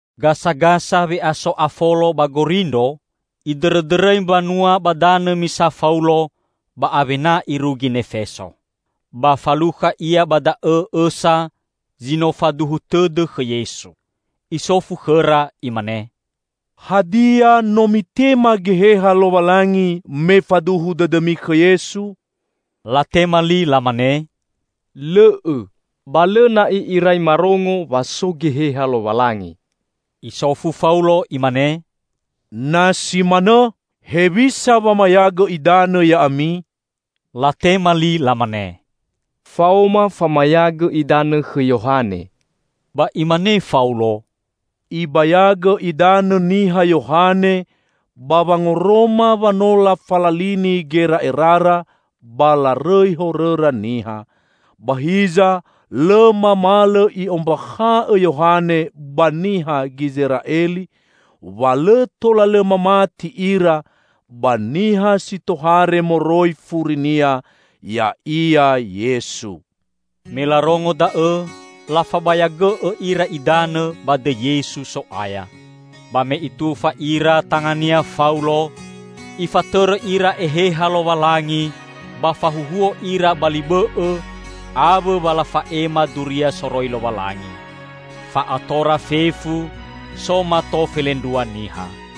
Gasagasa we'aso Afolo ba Gorindro, idõrõdõrõi mbanua ba danõ misa Faulo, ba awena irugi Nefeso. Ba falukha ia ba da'õ õsa zi no faduhu tõdõ khõ Yesu. Isofu khõra, imane, "Hadia, no mitema Geheha Lowalangi me faduhu dõdõmi khõ Yesu?" Latema li lamane, "Lõ'õ. Balõ na'i irai marongo wa so Geheha Lowalangi." Isofu Faulo imane, "Na si manõ, hewisa wamayagõ idanõ ya'ami?" Latema li lamane, "Faoma famayagõ idanõ khõ Yohane." Ba imane Faulo, "Ibayagõ idanõ niha Yohane ba wangoroma wa no lafalalini gera'erara ba larõi horõra niha. Ba hiza lõ mamalõ i'ombakha'õ Yohane ba niha Gizera'eli wa lõ tola lõ mamati ira ba niha si tohare moroi furinia, ya'ia Yesu." Me larongo da'õ, lafabayagõ'õ ira idanõ ba dõi Yesu So'aya. Ba me itufa ira tangania Faulo, Ifatõrõ ira Eheha Lowalangi, ba fahuhuo ira ba li bõ'õ awõ wa lafa'ema duria soroi Lowalangi. Fa'atora fefu so mato felendrua niha.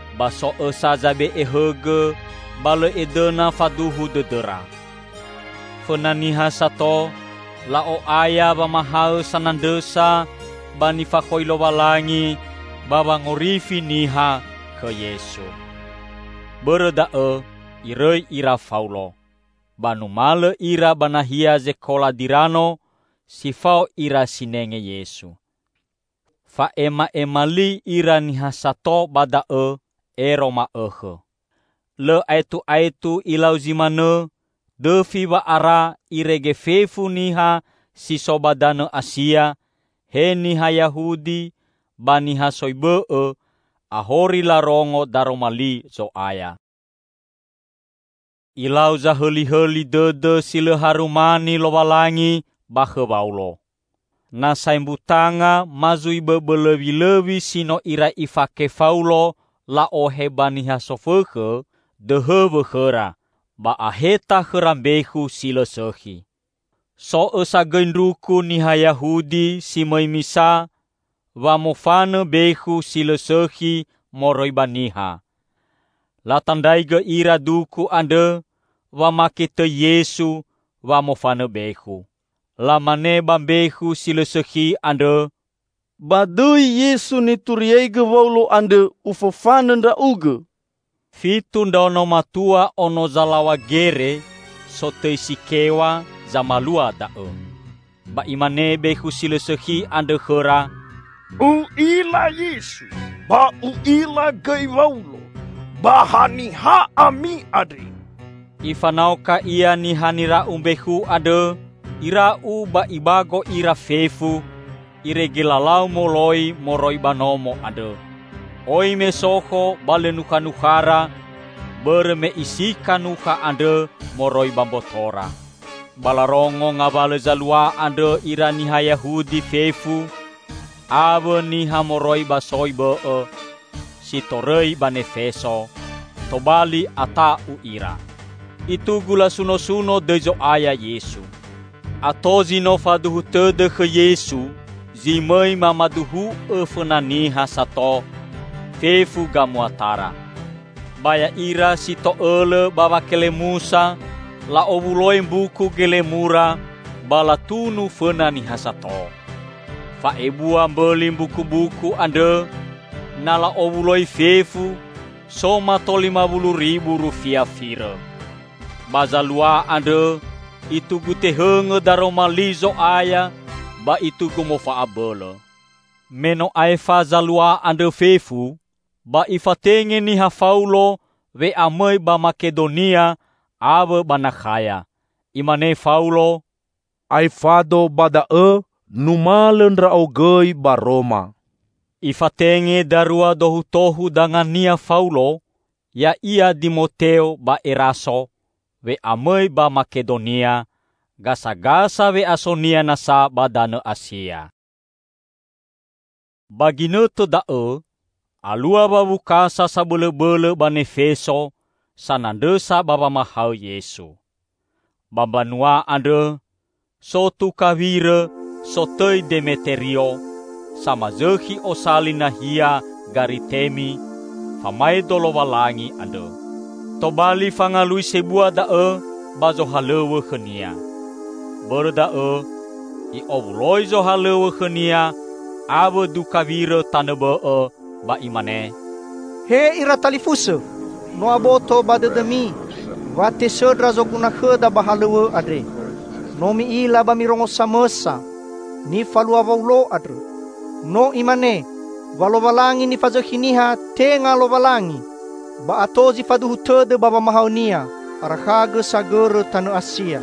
Ba so õsa zabe'e hõgõ ba lõ edõna faduhu dõdõra. Fõna niha sato la'o'aya wamahaõ sanandrõsa ba nifakhoi Lowalangi ba wangorifi niha khõ Yesu. Bõrõ da'õ irõi ira Faulo, ba numalõ ira ba nahia zekola Dirano si fao ira sinenge Yesu. Fa'ema'ema li ira niha sato ba da'õ ero ma'õkhõ. Lõ aetu'aetu ilau zi manõ dõfi wa'ara irege fefu niha si so ba danõ Asia, he niha Yahudi ba niha soi bõ'õ, ahori larongo Daroma Li Zo'aya. Ilau zahõlihõli dõdõ si lõ harumani Lowalangi ba khõ Waulo. Na saembutanga ma zui bõbõ lõwilõwi si no irai ifake Faulo la'ohe ba niha sofõkhõ, dõhõ wõkhõra, ba aheta khõra mbekhu si lõ sõkhi. So õsa gõi ndruku niha Yahudi si mõi misa wamofanõ bekhu si lõ sõkhi moroi ba niha. Latandraigõ ira duku andrõ wamake tõi Yesu wamofanõ bekhu. Lamane ba mbekhu si lõ sõkhi andrõ, "Ba dõi Yesu nituriaigõ Waulo andrõ, ufofanõ ndra'ugõ!" Fitu ndraono matua ono zalaw̃a gere, sotõi Sikew̃a, zamalua da'õ. Ba imane bekhu si lõ sõkhi andrõ khõra, "U'ila Yesu ba u'ila gõi Waulo, ba haniha ami andre?" Ifanaoka ia niha nira'u mbekhu andrõ, ira'u ba ibago ira fefu irege lalau moloi moroi ba nomo andrõ, oi mesokho ba lõ nukhanukhara bõrõ me isika nukha andrõ moroi ba mbotora. Ba larongo ngawalõ zalua andrõ ira niha Yahudi fefu awõ niha moroi ba soi bõ'õ si torõi ba Nefeso, tobali ata'u ira. Itugu lasunosuno dõi Zo'aya Yesu. Ato zi no faduhu tõdõ khõ Yesu zi mõi mamaduhu'õ fõna niha sato fefu gamuatara. Ba ya'ira si to'õlõ ba wakelemusa la'owuloi mbuku gelemura ba latunu fõna niha sato. Fa'ebua mbõli mbukubuku andrõ na la'owuloi fefu so mato lima wulu ribu rufia firõ. Ba zalua andrõ itugu tehõngõ daroma li Zo'aya ba itugu mofa'abõlõ. Me no aefa zalua andrõ fefu, ba ifatenge niha Faulo we'amõi ba Makedonia awõ ba Nakhaya. Imane Faulo, "Aefado ba da'õ numalõ ndra'o gõi ba Roma." Ifatenge darua dohutohu dangania Faulo, ya'ia Dimoteo ba Eraso, we'amõi ba Makedonia, gasagasa we'asonia nasa ba danõ Asia. Ba ginõtõ da'õ alua wawukasa sabõlõbõlõ ba Nefeso sanandrõsa ba wamahaõ Yesu. Ba mbanua andrõ so tuka wirõ sotõi Demeterio samazõkhi osali nahia Garitemi famaedo Lowalangi andrõ. Tobali fangalui sebua da'õ ba zohalõw̃õ khõnia. Bõrõ da'õ i'owuloi zohalõw̃õ khõnia awõ duka wirõ tanõ bõ'õ, ba imane, "He ira talifusõ! No aboto ba dõdõmi wa tesõndra zoguna khõda ba halõw̃õ andre. No mi'ila ba mirongo samõsa nifalua Waulo andrõ. No imane wa lowalangi nifazõkhi niha, tenga lowalangi. Ba ato zi faduhu tõdõ ba wamahaõnia, arakhagõ sagõrõ tanõ Asia.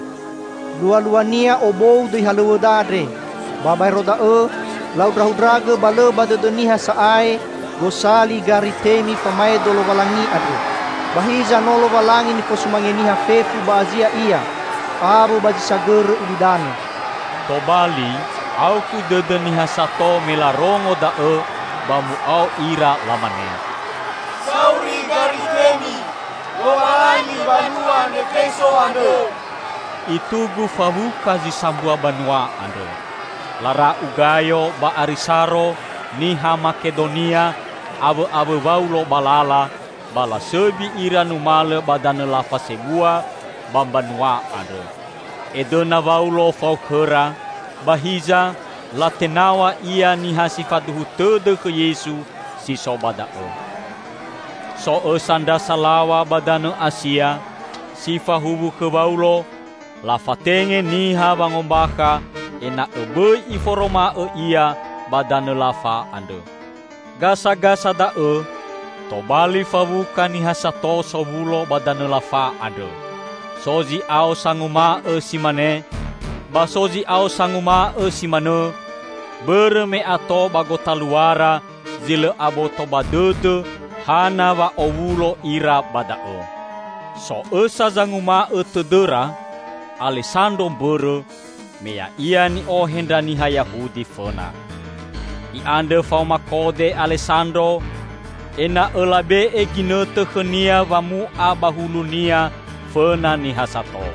Lualuania obou dõi halõw̃õda andre. Ba baero da'õ, lahundrahundragõ, ba lõ ba dõdõ niha sa'ae gosali Garitemi famaedo lowalangi andrõ; ba hiza no lowalangi nifosumange niha fefu ba Asia ia awõ ba zi sagõrõ ulidanõ!" Tobali aukhu dõdõ niha sato me larongo da'õ ba mu'ao ira lamane, "Sauri Garitemi, lowalangi mbanua Nefeso andrõ!" Itugu fawuka zi sambua banua andrõ. Lara'u Gayo ba Arisaro niha Makedonia awõ'awõ Waulo ba lala, ba lasõbi ira numalõ ba danõ lafa sebua ba mbanua andrõ. Edõna Waulo fao khõra, ba hiza latenaw̃a ia niha si faduhu tõdõ khõ Yesu si so ba da'õ. So õsa ndra salaw̃a ba danõ Asia, si fahuwu khõ Waulo, lafatenge niha wangombakha ena'õ bõi iforoma'õ ia ba danõ lafa andrõ. Gasagasa da'õ tobali fawuka niha sato sowulo ba danõ lafa andrõ. So zi'ao sanguma'õ si mane, ba so zi'ao sanguma'õ si manõ, bõrõ me ato ba gotaluara zi lõ aboto ba dõdõ hana wa owulo ira ba da'õ. So õsa zanguma'õ tõdõra, Alesandro mbõrõ, me ya'ia ni'ohe ndra niha Yahudi fõna. I'andrõ faoma kode Alesandro ena'õ labe'e ginõtõ khõnia wamu'a ba hulunia fõna niha sato.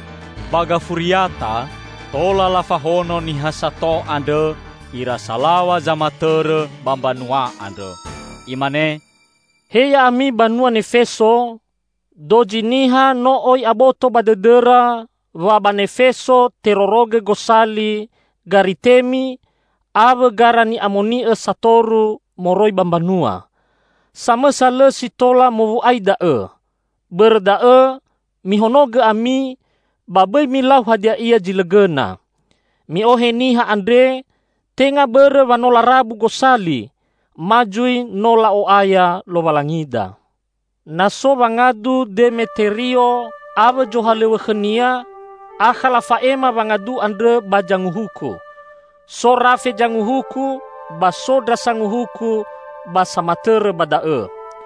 Ba gafuriata, tola lafahono niha sato andrõ ira salaw̃a zamatõrõ ba mbanua andrõ. Imane, "He ya'ami banua Nefeso! Dozi niha no oi aboto ba dõdõra wa ba Nefeso terorogõ gosali Garitemi awõ gara ni'amoni'õ satoru moroi ba mbanua. Samõsa lõ si tola mowu'ai da'õ. Bõrõ da'õ mihonogõ ami ba bõi milau hadia ia zi lõ gõna. Mi'ohe niha andre tenga bõrõ wa no larabu gosali ma zui no la'o'aya lowalangida. Na so wangadu Demeterio awõ zohalõw̃õ khõnia, akha lafa'ema wangadu andrõ ba zanguhuku. So rafe zanguhuku ba so ndra sanguhuku ba samatõrõ ba da'õ.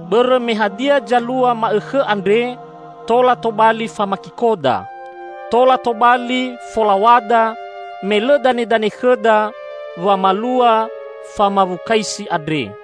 Bõrõ me hadia zalua ma'õkhõ andre tola tobali famakikoda. Tola tobali folaw̃ada, me lõ danedane khõda wamalua famawukaisi andre."